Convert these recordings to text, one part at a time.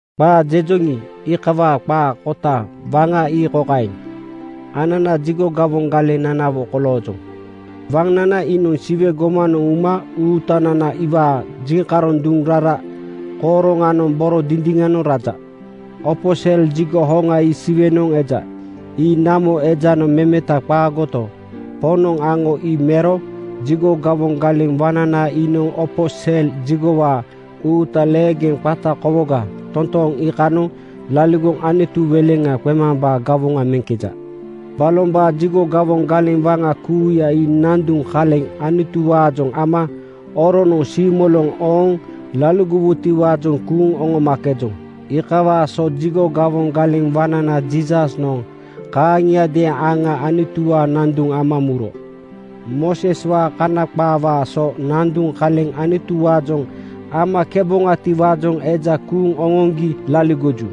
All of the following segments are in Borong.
Qaa jejoŋi, iikawaa qaa kota waŋa ii kokaeŋ: Anana jigo gawoŋ galeŋ waŋnanawo koloojoŋ. Waŋnana iinoŋ Siwe gomanoŋ uma Uutanana iwaa jiŋkaroŋ duŋ rara kooroŋanoŋ boro dindiŋanoŋ raja. Opo sel jigo hoŋa ii Siwenoŋ eja. Ii namo ejanoŋ memeta qaagoto, Poŋnoŋ aŋo ii mero. Jigo gawoŋ galeŋ waŋnana iinoŋ opo sel jigowaa uuta leegeŋ qata kowoga totooŋ iikanoŋ laligoŋ Anutu weleŋa qemambaa gawoŋa meŋkeja. Balombaa jigo gawoŋ galeŋ waŋa kuuya ii nanduŋ kaleŋ Anutuwaajoŋ ama oronoŋ siimoloŋ ooŋ laligowutiwaajoŋ kuuŋ oŋomakejoŋ. Iikawaa so jigo gawoŋ galeŋ waŋnana Jiisasnoŋ kaaŋiadeeŋ aŋa Anutuwaa nanduŋ ama muro. Mooseswaa Kana qaawaa so nanduŋ kaleŋ Anutuwaajoŋ amakeboŋatiwaajoŋ eja kuuŋ oŋoŋgi laligoju.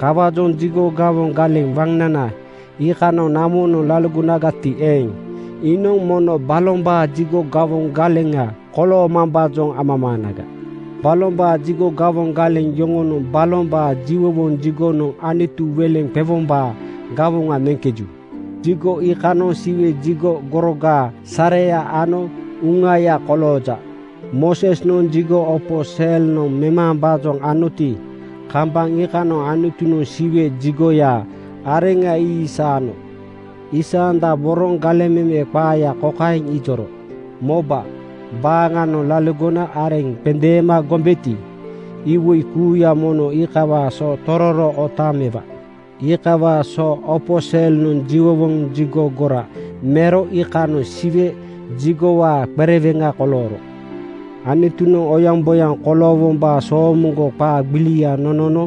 Kawaajoŋ jigo gawoŋ galeŋ waŋnana iikanoŋ namonoŋ laligonagati eeŋ, iinoŋ mono balombaa jigo gawoŋ galeŋa koloomambaajoŋ amamaanaga. Balombaa jigo gawoŋ galeŋ yoŋonoŋ balombaa jiwowoŋ jigonoŋ Anutu weleŋa qewombaa gawoŋa meŋkeju. Jigo iikanoŋ Siwe jigo gorogaa sareya ano uŋaya kolooja. Moosesnoŋ jigo opo selnoŋ memambaajoŋ anoti, kambaŋ iikanoŋ Anutunoŋ Siwe jigoyaa areŋa ii isaano. Aisandaboroŋ galeŋ meme qaaya kokaeŋ ijoro, “Moba, baaŋanoŋ laligona areŋ qendeema gombeti, iwoi kuuya mono iikawaa so tororo otaaŋ mewa.” Iikawaa so opo selnoŋ jiwowoŋ jigo gora mero iikanoŋ Siwe jigowaa qereweŋa kolooro. Anutunoŋ oyaŋboyaŋ koloowombaa soomoŋgo qaa gbilia nonono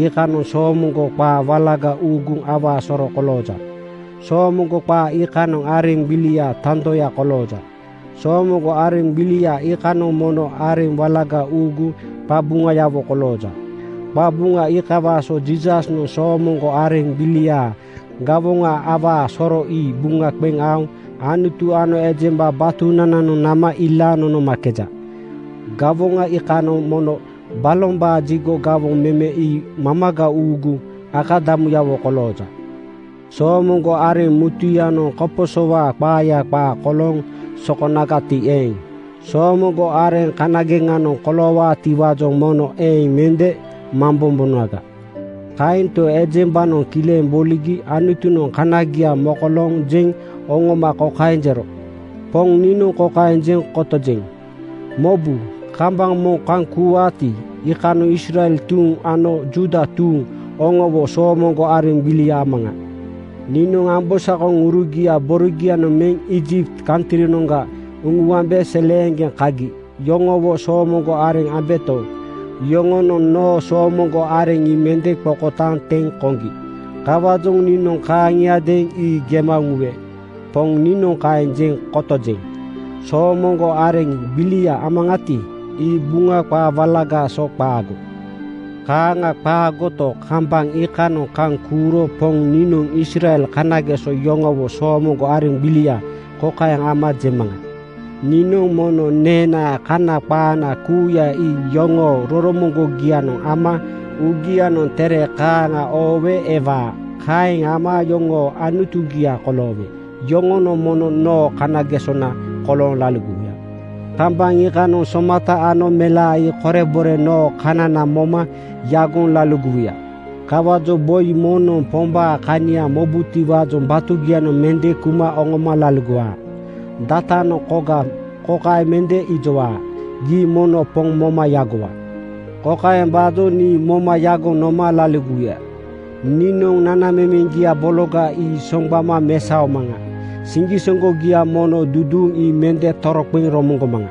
iikanoŋ soomoŋgo qaa walaga uuguŋ awaa soro kolooja. Soomoŋgo qaa iikanoŋ areŋ gbiliaa tandoya kolooja. Soomoŋgo areŋ gbilia iikanoŋ mono areŋ walaga uuguŋ qabuŋayawo kolooja. Qabuŋa iikawaa so Jiisasnoŋ soomoŋgo areŋ gbiliaa gawoŋa awaa soro ii buŋa qeŋ aoŋ Anutu ano ejemba batunananoŋ nama ilaaŋ nonomakeja. Gawoŋa iikanoŋ mono balombaa jigo gawoŋ meme ii mamaga uuguŋ akadamuyawo kolooja. Soomoŋgo areŋ mutuyanoŋ koposowaa qaaya qaa kolooŋ sokonagati eeŋ, soomoŋgo areŋ kanageŋanoŋ koloowaatiwaajoŋ mono eeŋ mende mambombonaga. Kaento, ejembanoŋ kileŋ boligi Anutunoŋ kanagia mokolooŋ jeŋ oŋoma kokaeŋ jero, “Poŋ niinoŋ kokaeŋ jeŋ kotojeŋ: Mobu! Kambaŋ moŋ kaŋ kuuwaati, iikanoŋ Israel tuuŋ ano Juuda tuuŋ oŋowo soomoŋgo areŋ gbilia amaŋa. Niinoŋ ambosakoŋurugia borogianoŋ meŋ Iijipt kantrinoŋga uŋuambe seleeŋgeŋ kagi yoŋowo soomoŋgo areŋ ambeto, yoŋonoŋ noo soomoŋgo areŋ ii mende qokotaaŋ teŋ koŋgi. Kawaajoŋ niinoŋ kaaŋiadeeŋ ii gema uŋuwe. Poŋ niinoŋ kaeŋ jeŋ kotojeŋ. Soomoŋgo areŋ gbilia amaŋati, ii Buŋa qaa walagaa so qaago. Kaaŋa qaagoto, kambaŋ iikanoŋ kaŋ kuuro Poŋ niinoŋ Israel kanageso yoŋowo soomoŋgo areŋ gbilia kokaeŋ ama jemaŋa: Niinoŋ mono neenaa Kana qaana kuuya ii yoŋoo roromoŋgogianoŋ ama uugianoŋ tere kaaŋa oowe ewaa. Kaeŋ ama yoŋoo Anutugia koloowe yoŋonoŋ mono noo kanagesona kolooŋ laligowuya. Kambaŋ iikanoŋ somata ano melaa ii korebore noo kanana moma yagoŋ laligowuya. Kawaajoŋ boi moŋnoŋ Pombaa kania mobutiwaajoŋ batugianoŋ mende kuma oŋoma laligowaa. Datanoŋ koga kokaeŋ mende ijowaa, ‘Gii mono Poŋ moma yagowa.’ Kokaembaajoŋ nii moma yagoŋ noma laligowuya: Niinoŋ nanamemeŋgia bologa ii soŋgbama mesaomaŋa. Siŋgisoŋgogia mono duduuŋ ii mende toroqeŋ romoŋgomaŋa.”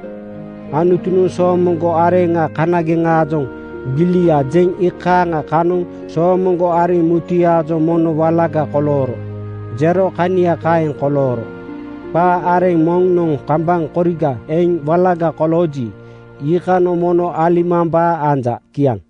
Anutunoŋ soomoŋgo areŋa kanageŋaajoŋ “Gbilia” jeŋ iikaaŋa kanoŋ soomoŋgo areŋ mutuyaajoŋ “Mono walaga kolooro,” jero kania kaeŋ kolooro. Qaa areŋ moŋnoŋ kambaŋ koriga eŋ walaga kolooji, iikanoŋ mono alimambaa anja. Kiaŋ.